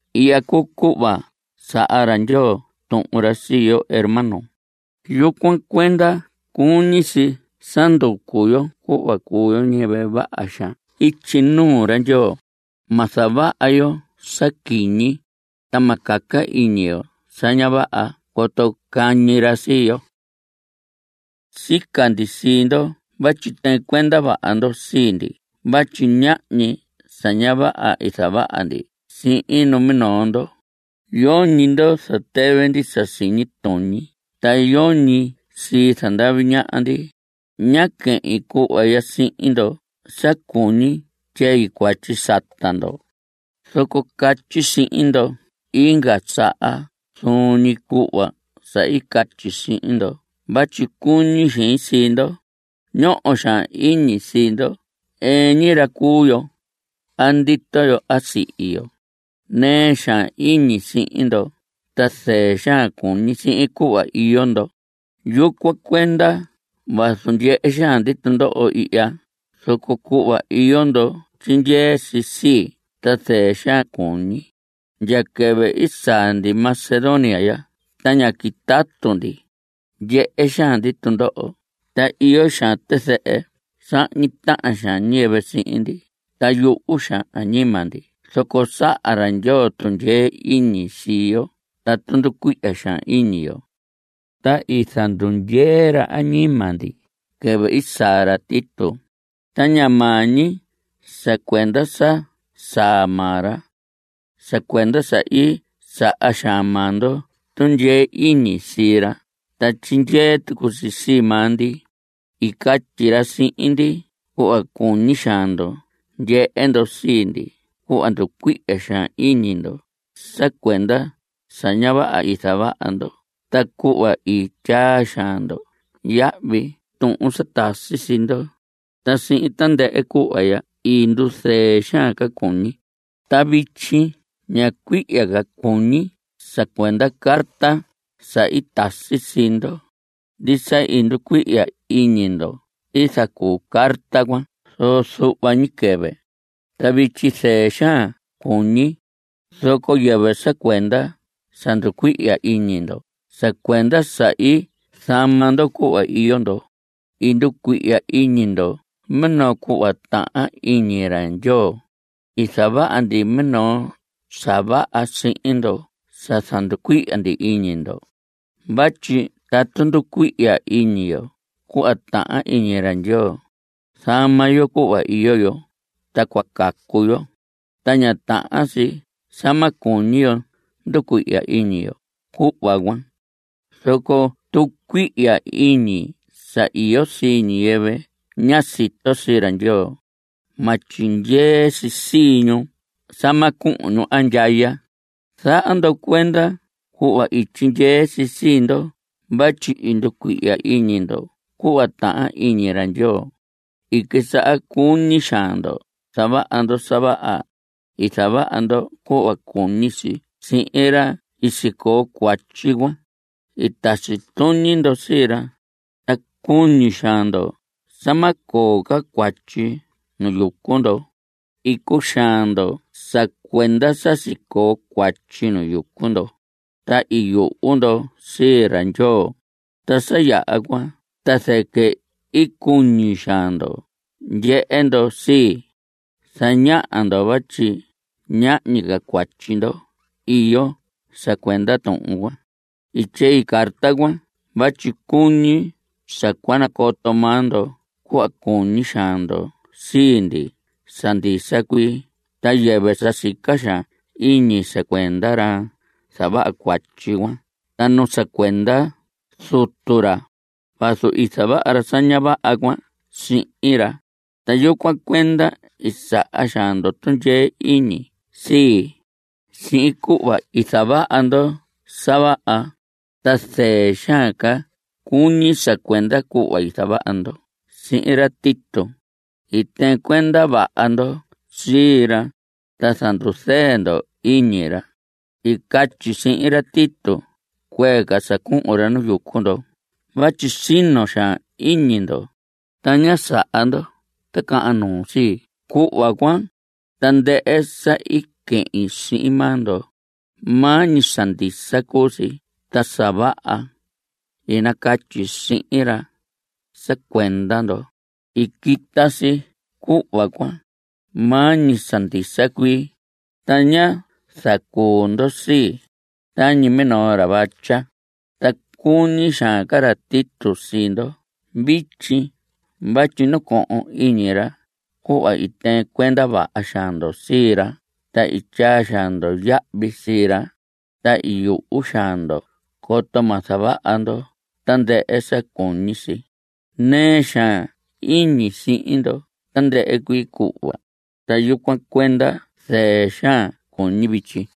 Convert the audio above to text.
Ihya cuu cuhva saha ra Ndyoo tuhun ra sii yo, hermanos. Yucuan cuenda cuñi si sa nducu yo cuhva cuu yo ñiyɨvɨ vaha xaan ityi nuu ra Ndyoo. Ma zavaha yo sa quiñi, ta ma caca iñi yo sa ña vaha coto cañi ra sii yo. Sica ndi sii ndo vatyi tɨɨn cuenda vaha ndo sii ndi vatyi ñahñi sa ña vaha i zavaha ndi sihin numinoo ndo. Yoñi ndo zatɨvɨ ndi sa siñi tuñi, ta yoñi sii zandavi ñaha ndi. Ña quehin cuhva ya sihin ndo sa cuñi tyei cuatyi sata ndo. Zoco catyi sihin ndo inga saha zuun ñi cuhva sa i catyi sihin ndo vatyi cuñi xein sii ndo. Ñoho xaan iñi sii ndo. Ɨɨn ñi ra cuu yo a ndito yo a sa sihi yo. Nɨɨ xaan iñi sihin ndo, ta zɨɨ xaan cuñi sihin cuhva iyo ndo. Yucuan cuenda vazu ndyehe xaan ndi tundoho ihya, zoco cuhva iyo ndo tyindyee si sii, ta zɨɨ xaan cuñi. Ndya quɨvɨ i saa ndi Macedonia ya ta ñá quitatu ndi. Ndyehe xaan ndi tundoho, ta iyo xaan tizɨhɨ. Sahñi tahan xaan ñiyɨvɨ sihin ndi, ta yuhu xaan añima ndi. Zoco saha ra Ndyoo tundyee iñi sii yo tatu nducuihya xaan iñi yo, ta i zandundyee ra añima ndi quɨvɨ i saa ra Tito. Ta ña maa ñi sa cuenda sa saa maa ra, sa cuenda sa i saha xaan maa ndo tundyee iñi sii ra ta tyindyee tucu si sii maa ndi. I catyi ra sihin ndi cuhva cuñi xaan ndo ndyehe ndo sii ndi, cuhva nducuihya xaan iñi ndo sa cuenda sa ña vaha i zavaha ndo ta cuhva i tyaa xaan ndo yahvi tuhun sa tasi sii ndo. Ta sihin tandɨhɨ cuhva ya i nduzɨɨ xaan ca cuñi. Ta vityi ña cuihya ca cuñi sa cuenda carta sa i tasi sii ndo. Ndisa i nducuihya iñi ndo i zacuu carta cuan, zoco zuhva ñi quɨvɨ. Ta vityi zɨɨ xaan cuñi, zoco yɨvɨ sa cuenda sa nducuihya iñi ndo, sa cuenda sa i zama ndo cuhva iyo ndo. I nducuihya iñi ndo minoo cuhva tahan iñi ra Ndyoo. I zavaha ndi minoo sa vaha sihin ndo sa zanducuihya ndi iñi ndo. Vatyi tatu nducuihya iñi yo cuhva tahan iñi ra Ndyoo, zama yo cuhva iyo yo, ta cua cacu yo. Ta ña tahan si sa ma cuñi yo nducuihya iñi yo cuhva cuan. Zoco tucuihya iñi sa iyo sii ñiyɨvɨ ña sito sii ra Ndyoo, ma tyindyee si sii ñu sa ma cuhun ñu andyaya. Zaha ndo cuenda cuhva i tyindyee si sii ndo vatyi i nducuihya iñi ndo cuhva tahan iñi ra Ndyoo. I quisaha cuñi xaan ndo zavaha ndo sa vaha. I zavaha ndo cuhva cuñi si sihin ra sicoo cuatyi cuan. I tasi tuñi ndo sii ra, ta cuñi xaan ndo sa ma coo ca cuatyi nu yucu ndo. I cuxaan ndo sa cuenda sa sicoo cuatyi nu yucu ndo, ta i yuhu ndo sii ra Ndyoo. Ta sa yaha cuan ta zɨquɨ i cuñi xaan ndo ndyehe ndo sii. Zañaha ndo vatyi ñahñi ca cuatyi ndo iyo sa cuenda tuhun cuan. I tyei carta cuan vatyi cuñi sa cua nacoto maa ndo cuhva cuñi xaan ndo sii ndi sa ndisa cuii ta yɨvɨ sa sica xaan iñi sa cuenda ra zavaha cuatyi cuan ta nu sa cuenda zutu ra, vazu i zavaha ra sa ña vaha cuan sihin ra. Ta yucuan cuenda i saha xaan ndo tundyee iñi sii, sihin cuhva i zavaha ndo sa vaha, ta zɨɨ xaan ca cuñi sa cuenda cuhva i zavaha ndo sihin ra Tito. I tɨɨn cuenda vaha ndo sii ra, ta zanduzɨɨ ndo iñi ra. I catyi sihin ra Tito cuee ca sa cuhun ra nu yucu ndo vatyi sino xaan iñi ndo, ta ñá zaha ndo ticahan nuu sii, cuhva cuan. Tandɨhɨ sa i quehin sihin maa ndo, maa ñi sa ndisa cuu si. Ta sa vaha i nacatyi sihin ra sa cuenda ndo, i quita si cuhva cuan, maa ñi sa ndisa cuii, ta ñá zacuu ndo sii, tañi minoo ra vatya. Ta cuñi xaan ca ra Tito sii ndo vityi vatyi nacohon iñi ra cuhva i tɨɨn cuenda vaha xaan ndo sii ra ta i tyaa xaan ndo yahvi sii ra. Ta i yuhu xaan ndo coto ma zavaha ndo tandɨhɨ sa cuñi si. Nɨɨ xaan iñi sihin ndo tandɨhɨ cuii cuhva, ta yucuan cuenda zɨɨ xaan cuñi vityi.